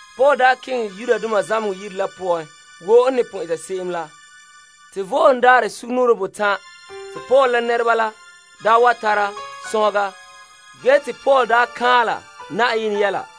Paul keŋɛ zamehegɔ yire la poan, wo n ne pon eta se'em la. Te Vo'ohogo Daarɛ sugumnɔɔren botan' te Paul la nɛreba la wa tara sɔnhega ge te Paul daa kaanla Yenɛ yɛla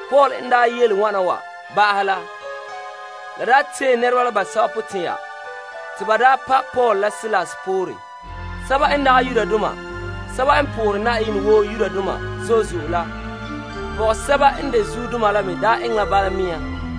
Yudoma basɛba la daa tee ba potɛn'ɛra te ba pa' Paul la Silas poore. Greekdoma basɛba n po'ohere Yenɛ zo'e zo'e la pɔgɔsɛba n de zuodoma la me eŋɛ la bala mea.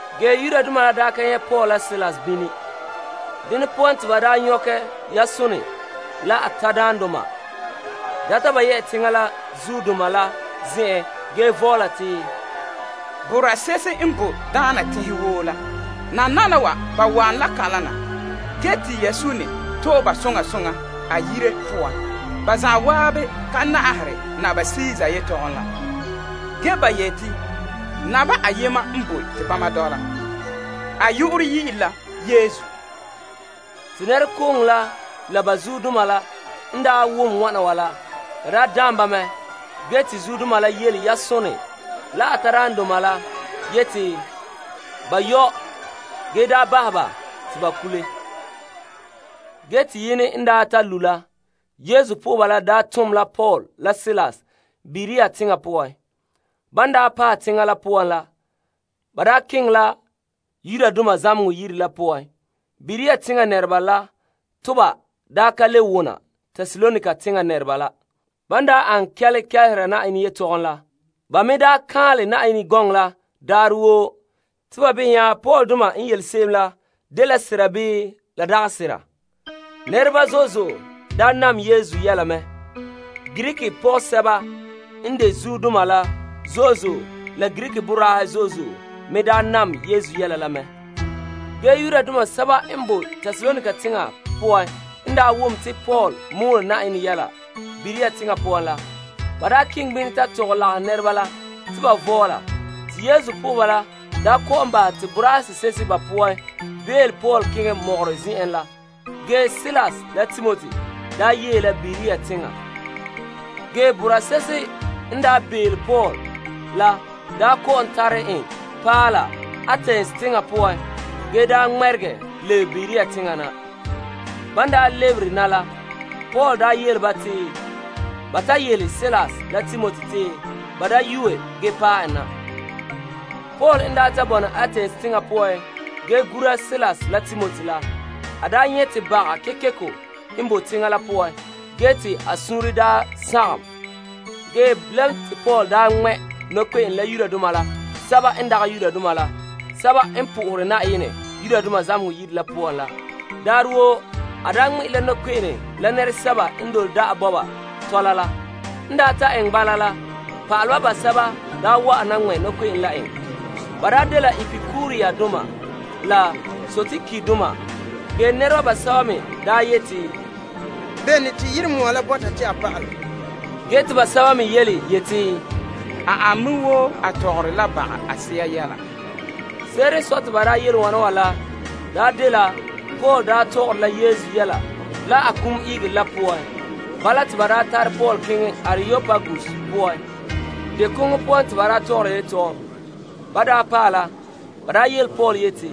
Yudoma n ka nyɛ' Paul la Silas bini, ba nyɔkɛ Yason la a tadaandoma data ba zuodoma la zen'en ge vɔɔla te, Boraa se'ehe n boe daana teŋhe woo ge nananawa ba wa'an la kalam na ge te Yasone to'e ba soŋa soŋa a yire poan. Ba zan'an ka na'ahere Kaesar yetɔgom ge te ba yete Naba ayema n boe te bama dɔla. A yu'urɛ dɛna la Yesu. Te nɛrekooŋɔ la la ba zuodoma la n wom wana wa la, la daam ba mɛ. Ge te zuodoma la yele Yasone la a tadaandoma la yete ba yɔ' ge bahɛ ba te ba kule. Ge te yene n ta lu' la, Yesu po'oheba la tom la Paul la Silas Berea teŋa poan. Ban paɛ teŋa la poan la, ba keŋɛ la zamehegɔ yire la poan. Berea teŋa nɛreba daa kelehere yɛla gana Tesalonika teŋa nɛreba la. Ban daa an la kɛle kelehera Yenɛ yetɔgom la. Ba me daa kan'anle Yenɛ gɔnɔ la daarɛ woo te ba behɛ nya Paul la Silas la n yele se'em la dela sera bii la dagɛ sera. Nɛreba zo'e zo'e nam Yesu yɛla mɛ. Greek pɔgɔsɛba n de zuodoma la zo'e zo'e la Greek boraahe zo'e zo'e me nam Yesu yɛla la mɛ. Ge Yudoma sɛba n boe Tesalonika teŋa poan n wom te Paul mɔɔlɛ Yenɛ yɛla Berea teŋa poan la, ba keŋɛ bini ta tɔgɛ lagahɛ nɛreba la te ba vɔɔla. Te Yesu po'oheba la kɔ'ɔn bahɛ te boraa se'ehe ba poan bele Paul keŋɛ mɔgɔrɛ zen'an la. Ge Silas la Timoti yee la Berea teŋa. Ge boraa se'ehe n bele Paul la kɔ'ɔn tare en paɛ la Atens teŋa poan ge ŋmɛrege lebe Berea teŋa na. Ban lebere na la, Paul yele ba te ba ta yele Silas la Timoti te ba da yuue ge paɛ en na. Paul n ta bɔna Atens teŋa poan ge gura Silas la Timoti la, a nyɛ' te baga kekeko n boe teŋa la poan ge te a suunre daa sagom. Ge bilam te Paul ŋmɛ' nɔkpe'ene la Yudoma la Greekdoma basɛba n po'ohere Yenɛ zamehegɔ yire la poan la. Daarɛ woo a ŋmɛ'ɛra la nɔkpe'ene la nɛresɛba n dole da'a bɔba tɔla la. En ta eŋɛ bala la, pa'aleba basɛba wa'an na ŋmɛ' nɔkpe'ene la en. Ba dela Epikurusdoma la Stoikdoma. Ge nɛreba basɛba me daa yeti, Bene te yirenmoa la bɔta te a pa'alɛ? Ge te sɛba me yeti, A an me wo a tɔgɔre la baga a se'a yɛla. Se'ere n sɔe te ba yele wana wa la daa dela Paul tɔgɔre la Yesu yele la a kum ihegere la poan. Bala te ba tare Paul keŋɛ Areopagus poan. Deo koŋɔ poan te ba tɔgɔra ba yetɔgom. Ban paɛ la, ba yele Paul yeti,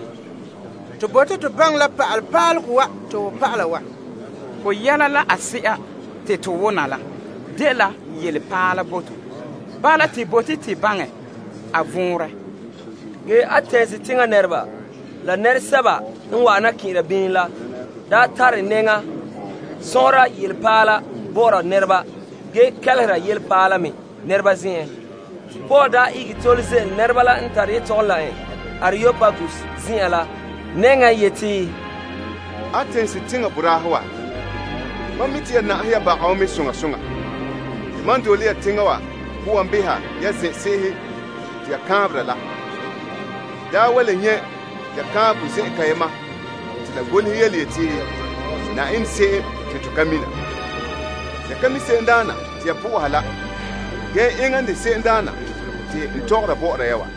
To bote to baŋɛ la pa'ale pa'alegɔ wa te ho pa'ala wa. Ho yɛla la a se'a te to wona la dela yelepaala bo to. Bala te bote to baŋɛ a vɔnrɛ. Ge Atens teŋa nɛreba la nɛresɛba n wa'an na kɛn'ɛra bini la daa tare nɛŋa sɔnhera yelepaala bɔ'ɔra nɛreba ge kelehere yelepaala me nɛreba zen'en. Te Paul ihege tole ze'ele nɛreba la n tare yetɔgom la en Areopagus zen'an la nɛŋa yeti, Atens teŋa boraahe wa, mam mi' te ya na'ahe ya baga wa. Te mam n dole ya teŋa wa poan behɛ ya zen'se'ehe te ya kaanbera la, n daa wa le nyɛ' ya kaanbegɔ zen'an kayema te la golehɛ yeti, Yenɛ Se'em Te To Ka Mina. Ya ka mi' se'emdaana te ya po'oha la ge enŋa n de se'emdaana te n tɔgɔra bɔ'ɔra ya wa.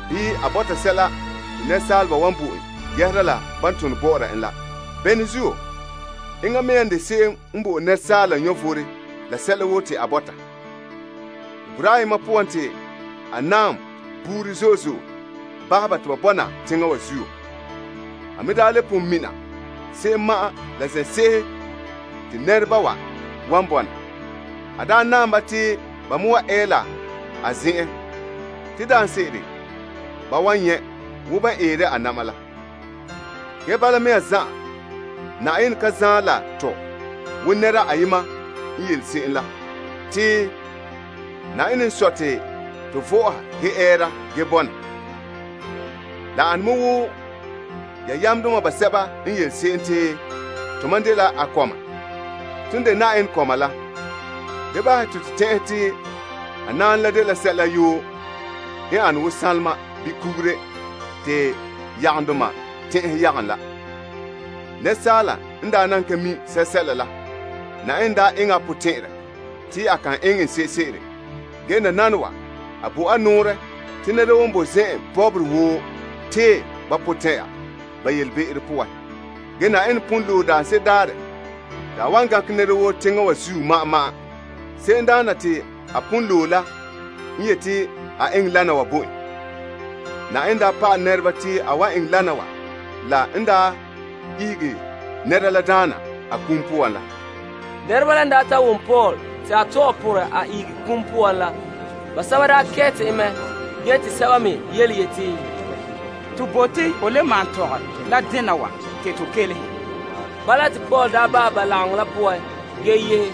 Bii a bɔta sɛla te saaleba wan bo en yɛhera la ban tone bɔ'ɔra en la. Bene zuo? Enŋa mea n de se'em ba bo'ore asaala vom la sɛla woo te a bɔta. Te boraa ayena poan te a naam buuri zo'e zo'e bahɛ ba te ba bɔna teŋa wa zuo. A mea daa le pon mina se'em ma'an la zen'sese te nɛreba wa wan bɔna. A daa naam ba te ba me wa ɛ la a zen'an. Te daanse'ere ba wan nyɛ' wo ban eere a na'ma la. Ge bala mea zan'an Yenɛ ka zaen la to wo nɛra ayema n yele se'em la te, Yenɛ n sɔe te to vɔ'ɔha ge ɛɛra ge bɔna. La ane me wo ya yamdoma basɛba n yele se'em te, Tomam dela a kɔma. Ton de Yenɛ kɔma la, da bahɛ ya te to tɛn'ɛhe te a naanɛ la dela sɛla dene n ane wo sanlema bii kugure te yagombahɛdoma tɛn'ɛhe yagom la. Asaala n daa nan ka mi' sɛla la Yenɛ eŋɛ a potɛn'ɛrɛ te a kan eŋɛ n sese'ere. Ge nananawa a bo a nɔɔrɛ te nɛra woo n bo zen'an bɔbɔre woo tee ba potɛn'ɛra ba yelebe'ero poan. Ge Yenɛ pon loe daanse'ere daarɛ te a wan gankɛ nɛra woo teŋa wa zuo ma'an ma'an. Se'emdaana te a pon loe la n yete a eŋɛ wana wa bo en. Yenɛ daa pa'alɛ nɛreba te a wan eŋɛ wana wa la n daa ihege nɛra la daana a kum poan la. Nɛreba la n ta wom Paul te a tɔgɛ porɛ a ihege a kum poan la, basɛba kɛɛte en mɛ. Ge te sɛba me yeti, To bote ho le maan tɔgɛ la dena wa te to kelehe. Bala te Paul bahɛ ba lagaŋɔ la poan ge yehe.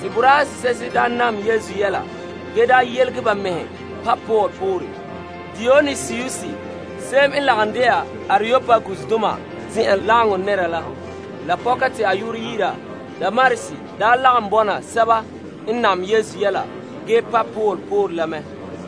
Te boraa se'ehe nam Yesu yɛla ge yelege ba mɛhe pa' Paul poore. Dionisius se'em n lagom de'a Areopagusdoma nɛra la pɔka te a yu'urɛ yi'ira Damaris lagom bɔna sɛba n nam Yesu yɛla ge pa' Paul poore la mɛ.